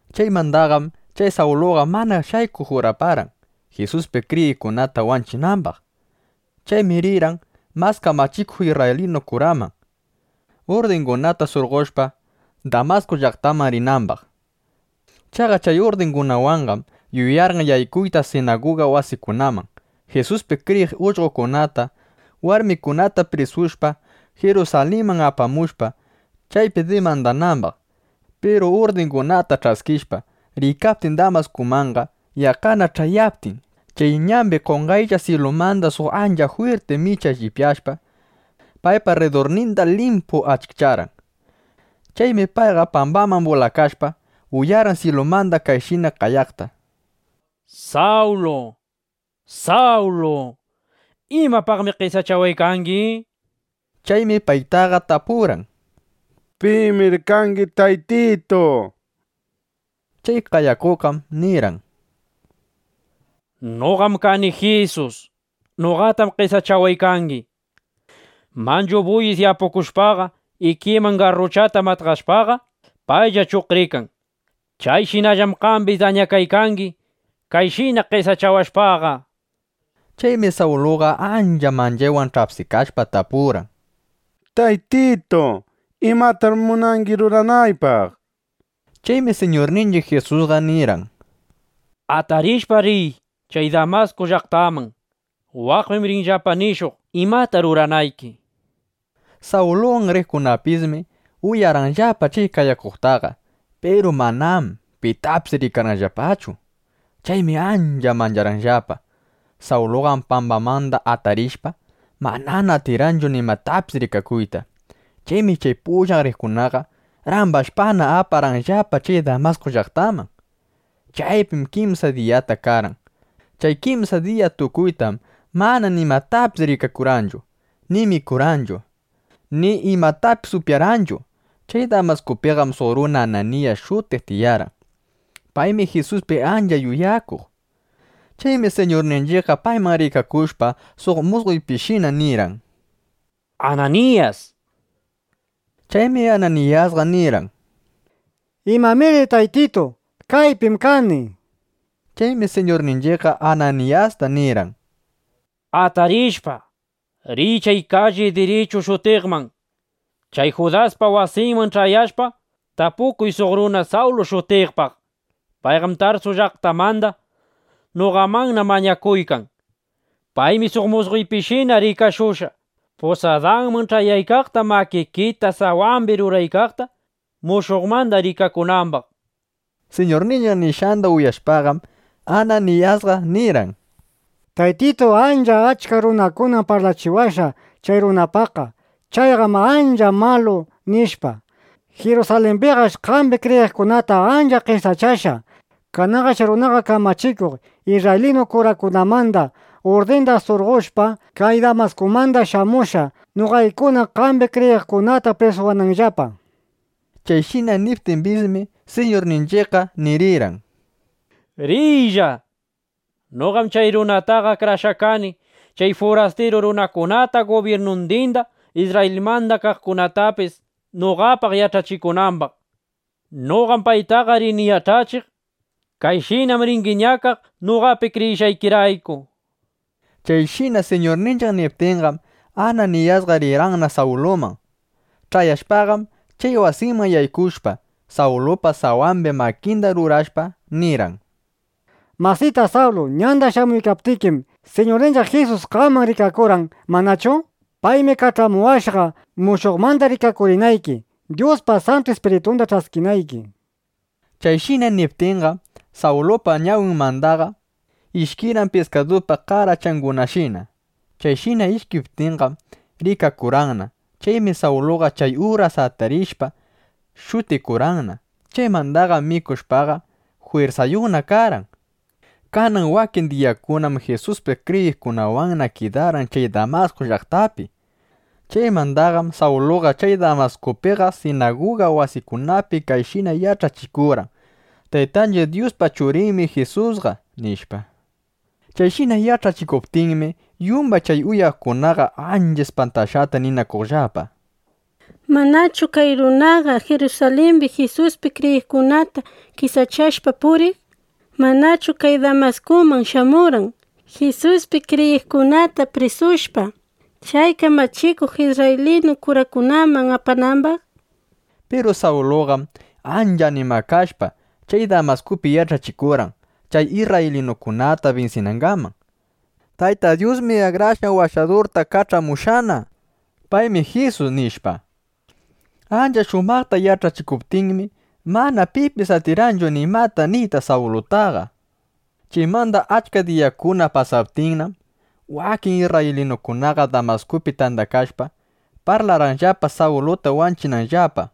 Chaykamanqam chay Sawluqa mana shaykuq juraparqan, Jisuspi kriyiqkunata wanchinambaq. Chaymi rirqan mas kamachikuq isrraylinu kuraman, urdingunata surqoshpa, Damasku llaqtaman rinambaq. Chaqa chay urdingunawanqam yuyarqan yaykuyta sinaguga wasikunaman, Jisuspi kriyiq ullqokunata, warmikunata prisushpa, Jirusalinman apamushpa, chaypi dimandanambaq. Piru urdingunata ch'askishpa, riykaptin Damaskumanqam, yaqqana ch'ayaptin, chay ñambiqa qonqaylla syilumanda suq ancha jwirti micha lliwyashpa, paypa rridurninda limpu achikcharqan. Chaymi payqa pambaman bulakashpa, uyarqan syilumanda kayshina qayaqta: —¡Sawlu, Sawlu! ¿Imapaqmi qesachawaykangi? nishpa. Chaymi payqa tapurqan: —¿Pimir kangi, Taytitu? nishpa. Chay qayakuqqam nirqan: —Noqam kani Jisus. Noqatam qesachawaykangi. ˻Manchu buyis yapukushpaqa, ikiman garruchata matqashpaqa, paylla chuqrikan. Chayshinallam qambis dañakaykangi, kayshina qesachawashpaqa, nishpa. Chaymi Sawluqa ancha manchaywan ch'apsikashpa, tapurqan: —Taytitu, ¿imatamir munangi ruranaypaq? nishpa. Chaymi Siñurninchiq Jisusqa nirqan:˼ —Atarishpa riy chay Damasku llaqtaman. Waqpim rinllapa nishuq, imata ruranayki, nishpa. Sawluwan riqkunapismi uyarqanllapa chay qayakuqtaqa. Piru manam pitapis rikarqanllapachu. Chaymi ancha mancharqanllapa. Sawluqam pambamanda atarishpa, manana atirqanchu nimatapis rikakuyta. Chaymi chay pullan riqkunaqa, rambashpana, aparqanllapa chay Damasku llaqtaman. Chaypim kimsa diyata karqan. Chay kimsa diya tukuytam mana nimatapis rikakurqanchu, ni mikurqanchu, ni imatapis upyarqanchu. Chay Damaskupiqam suq runa Ananiyas shutiq tiyarqan. Paymi Jisuspi ancha yuyakuq. Chaymi Siñurninchiqqa payman rikakushpa suq musqoypishina nirqan: —¡Ananiyas! nishpa. Chaymi Ananiyasqa nirqan: —¿Imamiri, Taytitu? Kaypim kani, nishpa. Chaymi Siñurninchiqqa Ananiyasta nirqan: —Atarishpa, riy chay kalli “Dirichu” shutiqman. Chay Judaspa wasinman ch'ayashpa, tapukuy suq runa Sawlu shutiqpaq. Payqam Tarsu llaqtamanda. Noqamannam mañakuykan. Paymi suq musqoypishina rikashushqa, pusadanman ch'ayaykaqta, makikita sawambi ruraykaqta, mushuqmanda rikakunambaq, nishpa. Siñurninchiq nishqanda uyashpaqam, Ananiyasqa nirqan: —Taytitu, achka runakunam parlachiwashqa chay runapaqqa: “Chayqam ancha malu”, nishpa. Jirusalimbiqash qambi kriyiqkunata ancha qesachashqa. Kananqash chay runaqa kamachikuq isrraylinu kurakunamanda urdingunata surqoshpa, kay Damaskumanna shamushqa, noqaykuna qambi kriyiqkunata prisuwananllapa, nishpa. Chayshina niptimbismi, Siñurninchiqqa nirirqan: —Riylla. Noqam chay runataqa akrashqa kani, chay furastiru runakunata gubyirnundinda, Isrrayilmanda kaqkunatapis noqapaq yach'achikunambaq. Noqam paytaqa rini yach'achiq: Kayshinam ringi ñakaq noqapi kriyishqaykirayku, nishpa. Chayshina Siñurninchiq niptinqam, Ananiyasqa rirqanna Sawluman. Ch'ayashpaqam, chay wasiman yaykushpa, Sawlupa sawambi makinda rurashpa, nirqan: —Masita Sawlu, ñanda shamuykaptikim, Siñurninchiq Jisus qaman rikakurqan, ¿manachu? Paymi kach'amuwashqa, mushuqmanda rikakurinayki, Dyuspa Santu Ispiritunda ch'askinayki, nishpa. Chayshina niptinqam, Sawlupa ñawinmanda ishkirqan piskadupa qarachangunashina. Chayshina ishkiptinqam, rikakurqanna. Chaymi Sawluqa chay uras atarishpa, shutikurqanna. Chaymandaqam mikushpaqa, jwirsayuqna karqan. Kanan wakin diyakunam Jisuspi kriyiqkunawanna kidarqan chay Damasku llaqtapi. Chaymandaqam Sawluqa chay Damaskupiqa sinaguga wasikunapina kayshina yach'achikurqan: —Taytanchiq Dyuspa Churinmi Jisusqa, nishpa. Chayshina yach'achikuptinmi, yumbay chay uyaqkunaqa ancha ispantashqata ninakuqllapa: —¿Manachu kay runaqa Jirusalimbi Jisuspi kriyiqkunata qesachashpa puriq? ¿Manachu kay Damaskuman shamurqan, Jisuspi kriyiqkunata prisushpa, chay kamachikuq isrraylinu kurakunaman apanambaq? nishpa. Piru Sawluqam ancha animakashpa, chay Damaskupi yach'achikurqan, chay isrraylinukunata binsinangaman: —Tayta Dyusmi Akrashqan Washadurta kach'amushqana. Paymi Jisus, nishpa. Ancha shumaqta yach'achikuptinmi, mana pipis atirqanchu nimata niyta Sawlutaqa. Chaymanda achka diyakuna pasaptinnam, wakin isrraylinukunaqa Damaskupi tandakashpa, parlarqanllapa Sawluta wanchinanllapa.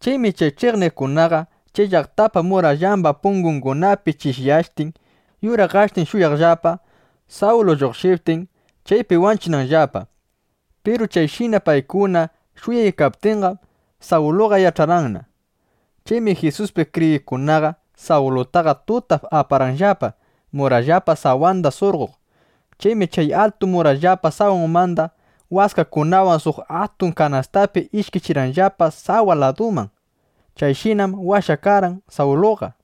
Chaymi chay ch'iqniqkunaqa chay llaqtapa murallamba pungungunapi chishyashtin yuraqashtin shuyaqllapa, Sawlu lluqshiptin, chaypi wanchinanllapa. Piru chayshina paykuna shuyaykaptinqam, Sawluqa yach'arqanna. Chaymi Jisuspi kriyiqkunaqa Sawlutaqa tutap aparqanllapa, murallapa sawanda surqoq. Chaymi chay altu murallapa sawanmanda waskakunawan suq atun kanastapi ishkichirqanllapa sawa laduman. Chayshinam washakarqan Sawluqa.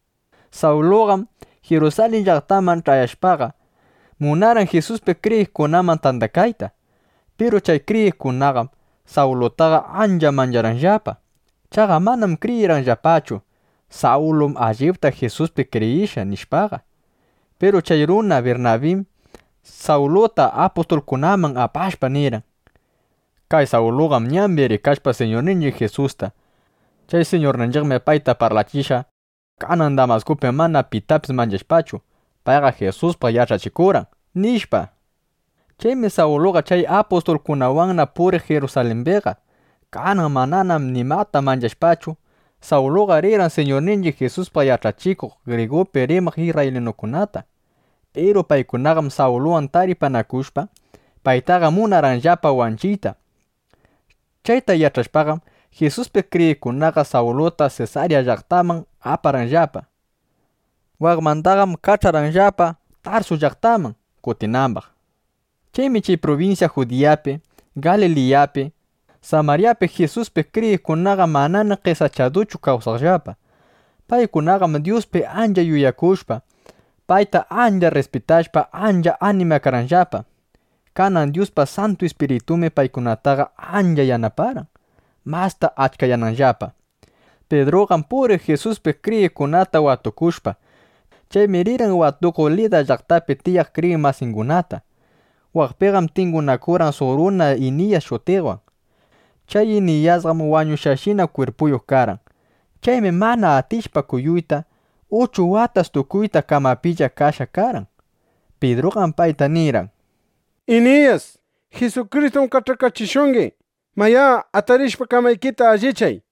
Sawluqam Jirusalin llaqtaman ch'ayashpaqa, munarqan Jisuspi kriyiqkunaman tandakayta. Piru chay kriyiqkunaqam Sawlutaqa ancha mancharqanllapa. Chaqa manam kriyirqanllapachu: Sawlum allipta Jisuspi kriyishqa, nishpaqa. Piru chay runa Birnabim Sawluta apustulkunaman apashpa, nirqan: —Kay Sawluqam ñambi rikashqa Siñurninchiq Jisusta. Chay Siñurninchiqmi payta parlachishqa. Kanan Damaskupim mana pitapis manchashpachu, payqa Jisuspaq yach'achikurqan, nishpa. Chaymi Sawluqa chay apustulkunawanna puriq Jirusalimbiqa. Kanan manam nimata manchashpachu, Sawluqa rirqan Siñurninchiq Jisuspaq yach'achiq grigupi rimaq isrraylinukunata. Piru paykunaqam Sawluwan taripanakushpa, paytaqa munarqanllapana wanchiyta. Chayta yach'ashpaqam, Jisuspi kriyiqkunaqa Sawluta Sesarya llaqtaman aparqanllapa. Waqmandaqam kach'arqanllapa, Tarsu llaqtanman kutinambaq. Chaymi chay prubinsya Judiyapi, Galiliyapi, Samaryapi Jisuspi kriyiqkunaqa manana qesachaduchu kawsaqllapa. Paykunaqam Dyuspi ancha yuyakushpa, payta ancha rrispitashpa ancha animakarqanllapa. Kanan Dyuspa Santu Ispiritunmi paykunataqa ancha yanaparqan, masta achkayananllapa. Pidruqam puriq Jisuspi kriyiqkunata watukushpa. Chaymi rirqan watukuq Lida llaqtapi tiyaq kriyiq masingunata. Waqpim tingunakurqan suq runa Iniyas shutiqwan. Chay Iniyasqam wañushqashina kwirpuyuq karqan. Chaymi mana atishpa kuyuyta, uchu watas tukuyta kamapilla kashqa karqan. Pidruqam payta nirqan: —Iniyas, Jisukristum kach'akachishungi. Mayá, atarishpa, kamaykita allichay, nishpa.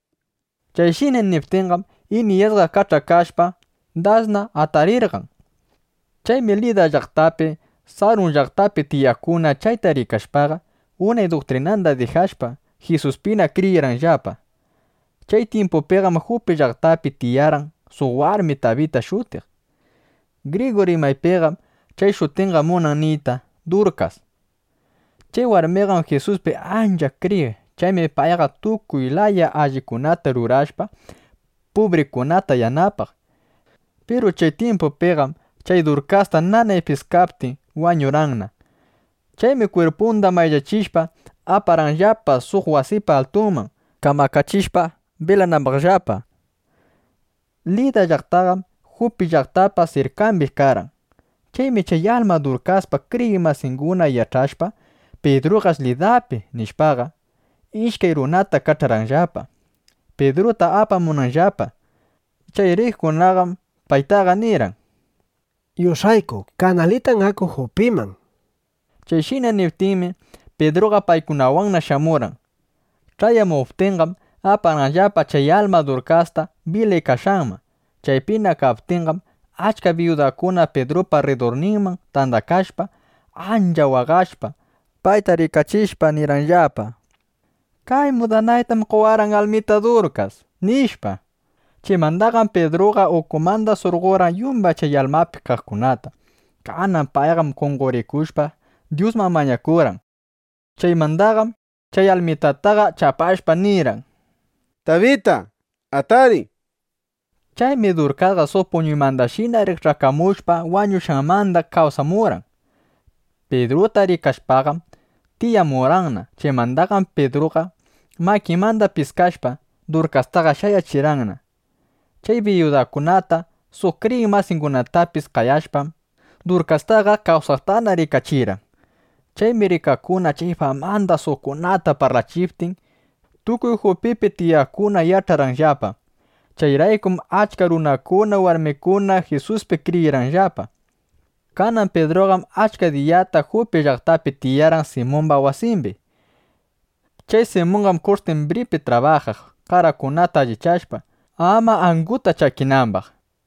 Chayshina niptinqam, Iniyasqa kach'akashpa, dasna atarirqan. Chaymi Lida llaqtapi, Sharun llaqtapi tiyaqkuna chayta rikashpaqa, unay duktrinanda dijashpa, Jisuspina kriyirqanllapa. Chay tyimpupiqam Jupi llaqtapi tiyarqan suq warmi Tabita shutiq. Grigu rimaypiqam chay shutinqa munan niyta “Durkas”. Chay warmiqam Jisuspi ancha kriyiq. Chaymi payqa tukuy laya allikunata rurashpa, pubrikunata yanapaq. Piru chay tyimpupiqam chay Durkasta nanay piskaptin, wañurqanna. Chaymi kwirpunda mayllachishpa, aparqanllapa suq wasipa altunman kamakachishpa bilanambaqllapa. Lida llaqtaqam Jupi llaqtapa sirkambi karqan. Chaymi chay alma Durkaspa kriyiq masinguna yach'ashpa: Pidruqash Lidapi, nishpaqa, ishkay runata kach'arqanllapa, Pidruta apamunanllapa. Chay riqkunaqam paytaqa nirqan: —Yush'ayku kanalitan aku Jupiman, nishpa. Chayshina niptinmi, Pidruqa paykunawanna shamurqan. Ch'ayamuptinqam, aparqanllapa chay alma Durkasta bilaykashqanman. Chaypina kaptinqam, achka biyudakuna Pidrupa rridurninman tandakashpa, ancha waqashpa, payta rikachishpa, nirqanllapa: —Kay mudanaytam qowarqan almita Durkas, nishpa. Chaymandaqam Pidruqa ukumanda surqorqan yumbay chay almapi kaqkunata. Kanan payqam qonqorikushpa, Dyusman mañakurqan. Chaymandaqam chay almitataqa chapashpa, nirqan: —Tabita, atariy, nishpa. Chaymi Durkasqa suq puñuymandashina rikch'akamushpa, wañushqanmanda kawsamurqan. Pidruta rikashpaqam, tiyamurqanna. Chaymandaqam Pidruqa, makinmanda piskashpa, Durkastaqa shayachirqanna. Chay biyudakunata, suq kriyiq masingunatapis qayashpam, Durkastaqa kawsaqtana rikachirqan. Chaymi rikaqkuna chay famata suqkunata parlachiptin, tukuy Jupipi tiyaqkuna yach'arqanllapa. Chayraykum achka runakuna, warmikuna Jisuspi kriyirqanllapa. Kanan Pidruqam achka diyata Jupi llaqtapi tiyarqan Simumba wasimbi. Chay Simunqam kush'tyimbripi trabajaq qarakunata allichashpa, ama anguta chakinambaq.